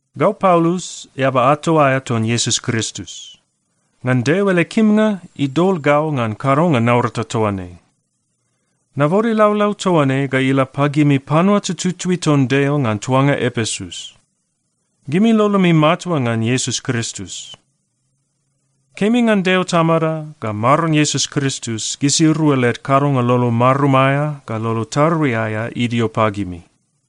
Gau Paulus, eaba ato aea ton Iesus Kristus. Ngan Deo ele kimnga, idol gau ngan kadonga naurata toa ne. Nabode laulau toa ne ga ila pagimi panua tututui ton Deo ngan tuanga Epesus. Gimi lolomi matua ngan Iesus Kristus. Kemi ngan Deo Tamada ga Maron Iesus Kristus, gisirua led kadonga lolo marum aea ga lolo tarui aea idio pagimi.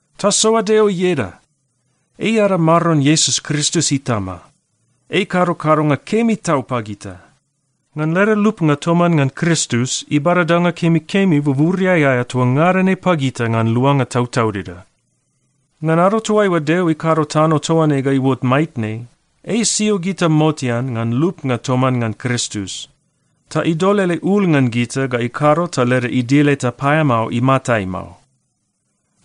Tasoa Deo ieda! Ei ada Maron Iesus Kristus Itama. Ei ikado kadonga kemi tau pagita. Ngan leda lupnga toman ngan Kristus, ibada danga kemikemi buburiai aea toa ngada ne pagita ngan luanga tautaudida. Ngan ado toaiua Deo ikado tano toa ne ga iuot maitne, ei isio gita motean ngan lupnga toman ngan Kristus, ta idol ele ul ngan gita ga ikado ta leda idil eta paeamao imatai mao.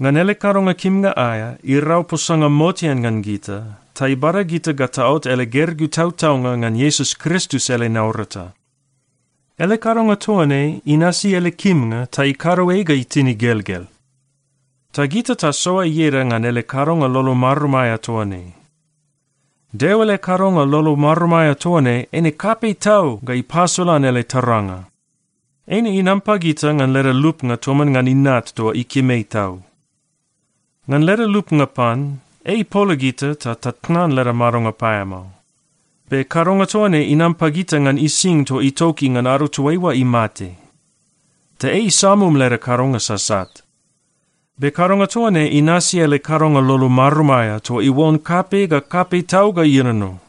Ngan ele kadonga kimnga aea irau posanga motean ngan gita ta ibada gita ga taot ele gergeu tautaunga ngan Iesus Kristus ele naurata. Ele kadonga toa ne inasi ele kimnga ta ikado ei ga itin igelgel. Ta gita tasoa ieda ngan ele kadonga lolo marum aea toa ne. Deo ele kadonga lolo marum aea toa ne eine kapei tau ga ipasolan ele taranga. Eine inam pagita ngan leda lupnga toman ngan Inat toa ikim ei tau. Ngan leda lupnga pan, ei ipola gita ta tatnan leda madonga paeamao. Be kadonga toa ne inam pagita ngan ising toa itoki ngan ado toaiua imate. Ta ei isamum leda kadonga sasat. Be kadonga toa ne inasi ele kadonga lolo marum aea toa iuon kapei ga kapei tau ga ienono.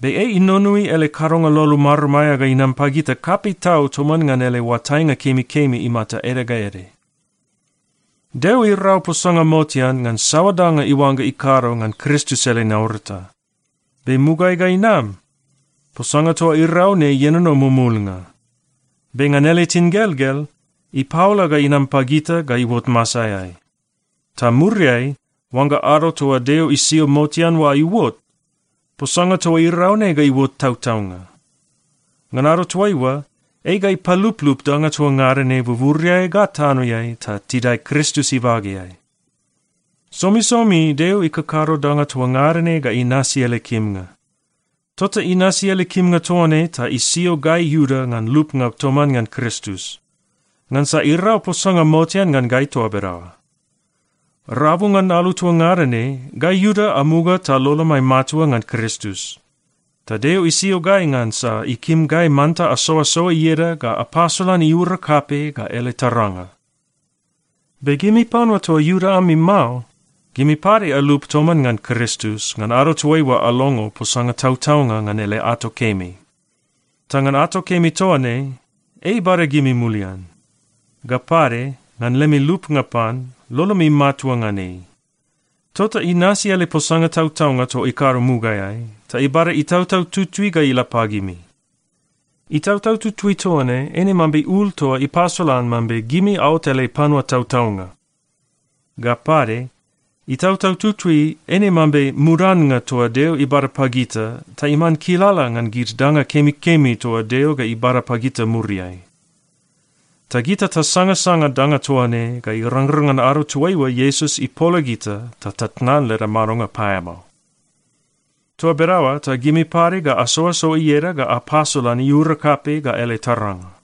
Be ei inonoi ele kadonga lolo marum aea ga inam pagita kapei tau toman ngan ele oatainga kemikemi imata ede ga ede. Deo irau posanga motean ngan saoa danga iuangga ikado ngan Kristus ele naurata. Be mugaeai ga inam, posanga toa irau ne ienono mumulnga. Be ngan ele tingelgel, ipaola ga inam pagita ga iuot masaeai. Ta muriai, oangga ado toa Deo isio motean oa iuot, posanga toa irau ne ga iuot tautaunga. Ngan ado toaiua, ei ga ipaluplup danga toa ngada ne buburiai ga tanoeai ta tidae Kristus ibageai. Somisomi Deo ikakado danga toa ngada ne ga inasi ele kimnga. Tota inasi ele kimnga toa ne ta isio gai Iuda ngan lupnga toman ngan Kristus, ngansa irau posanga motean ngan gai toa bedaoa. Rabu ngan alu toa ngada ne, gai Iuda amuga ta lolomai matua ngan Kristus. Ta Deo isio gai ngansa ikim gai manta asoasoa ieda ga apasolan iura kapei ga ele taranga. Be gimi panua toa Iuda ami mao, gimi pade alup toman ngan Kristus ngan ado toaiua alongo posanga tautaunga ngan ele ato kemi. Ta ngan ato kemi toa ne, ei ibada gimi mulian. Ga pade ngan lemi lupnga pan, lolomi matua ngan ei. Tota inasi ele posanga tautaunga toa ikado mugaeai, ta ibada Itautau Tutui ga ila pagimi. Itautau Tutui toa ne eine mambe ul toa ipasolan mambe gimi aot ele panua tautaunga. Ga pade, Itautau Tutui eine mambe mudannga toa Deo ibada pagita ta iman kilala ngan gid danga kemikemi toa Deo ga ibada pagita muriai. Ta gita tasangasanga danga toa ne ga irangrang ngan ado toaiua Iesus ipola gita ta tatnan leda madonga paeamao. Toa bedaoa ta gimi pade ga asoasoa ieda ga apasolan iura kapei ga ele taranga.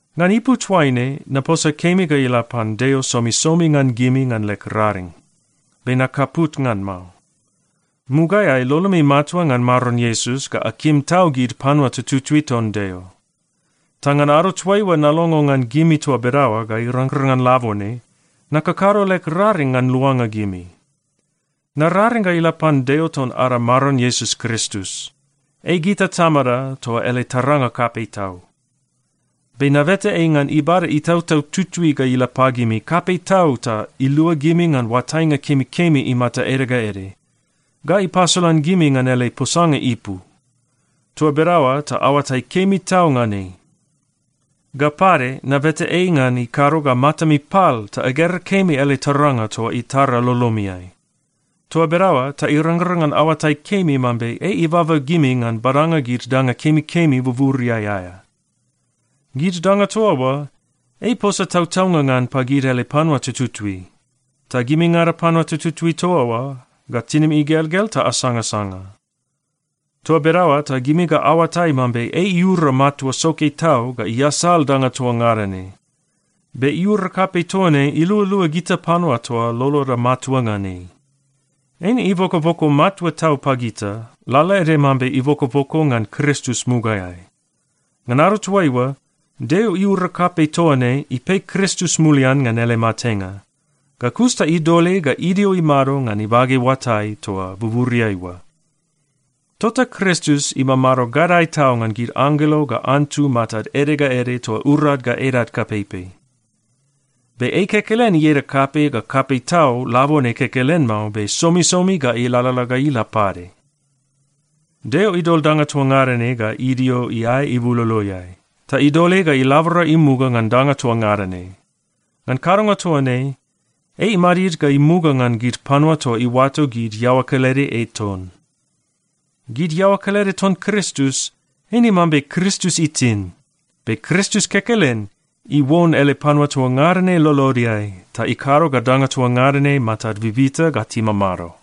Ngan ipu toaine, naposa kemi ga ila pan Deo somisomi ngan gimi ngan leg raring, be nakaput ngan mao. Mugaeai lolomi matua ngan Maron Iesus ga akim tau gid panua tututui ton Deo. Ta ngan ado toaiua nalongo ngan gimi toa bedaoa ga irangrang ngan labone, nakakado leg raring ngan luanga gimi. Nararing ga ila pan Deo ton ada Maron Iesus Kristus. Ei gita Tamada toa ele taranga kapei tau. Be nabeta ei ngan ibada Itautau Tutui ga ila pagimi kapei tau ta ilua gimi ngan oatainga kemikemi imata ede ga ede, ga ipasolan gimi ngan ele posanga ipu. Toa bedaoa ta aoatai kemi tau ngan ei. Ga pade, nabeta ei ngan ikado ga matami pal ta agera kemi ele taranga toa itara lolomiai. Toa bedaoa ta irangrang ngan aoatai kemi mambe ei ibaba gimi ngan badanga gid danga kemikemi buburiai aea. Gid danga toa oa, ei iposa tautaunga ngan pagid ele panua tututui. Ta gimingada panua tututui toa oa ga tinimi igelgel ta asangasanga. Toa bedaoa ta gimi ga aoatai mambe ei iura matua soke tau ga iasal danga toa ngada ne. Be iura kapei toa ne ilualua gita panua toa loloda matua ngan ei. Eine ibokoboko matua tau pagita, lalaede mambe ibokoboko ngan Kristus mugaeai. Ngan ado toaiua, Deo iura kapei toa ne ipei Kristus mulian ngan ele matenga. Ga kus ta idol ei ga idio imado ngan ibage oatai toa buburiai oa. Tota Kristus imamado gadae tau ngan gid anggelo ga antu matad ede ga ede toa urad ga edad kapeipei. Be ei kekelen ieda kapei ga kapei tau labone kekelen mao, be somisomi ga ilalala ga ila pade. Deo idol danga toa ngada ne ga idio iae ibuloloeai, ta idol ei ga ilabora imuga ngan danga toa ngada ne. Ngan kadonga toa ne, ei imadid ga imuga ngan gid panua toa iuato gid iaoa kelede ei ton. Gid iaoa kelede ton Kristus, eine mambe Kristus itin. Be Kristus kekelen iuon ele panua toa ngada ne lolodeai ta ikado ga danga toa ngada ne matad bibita ga timamado.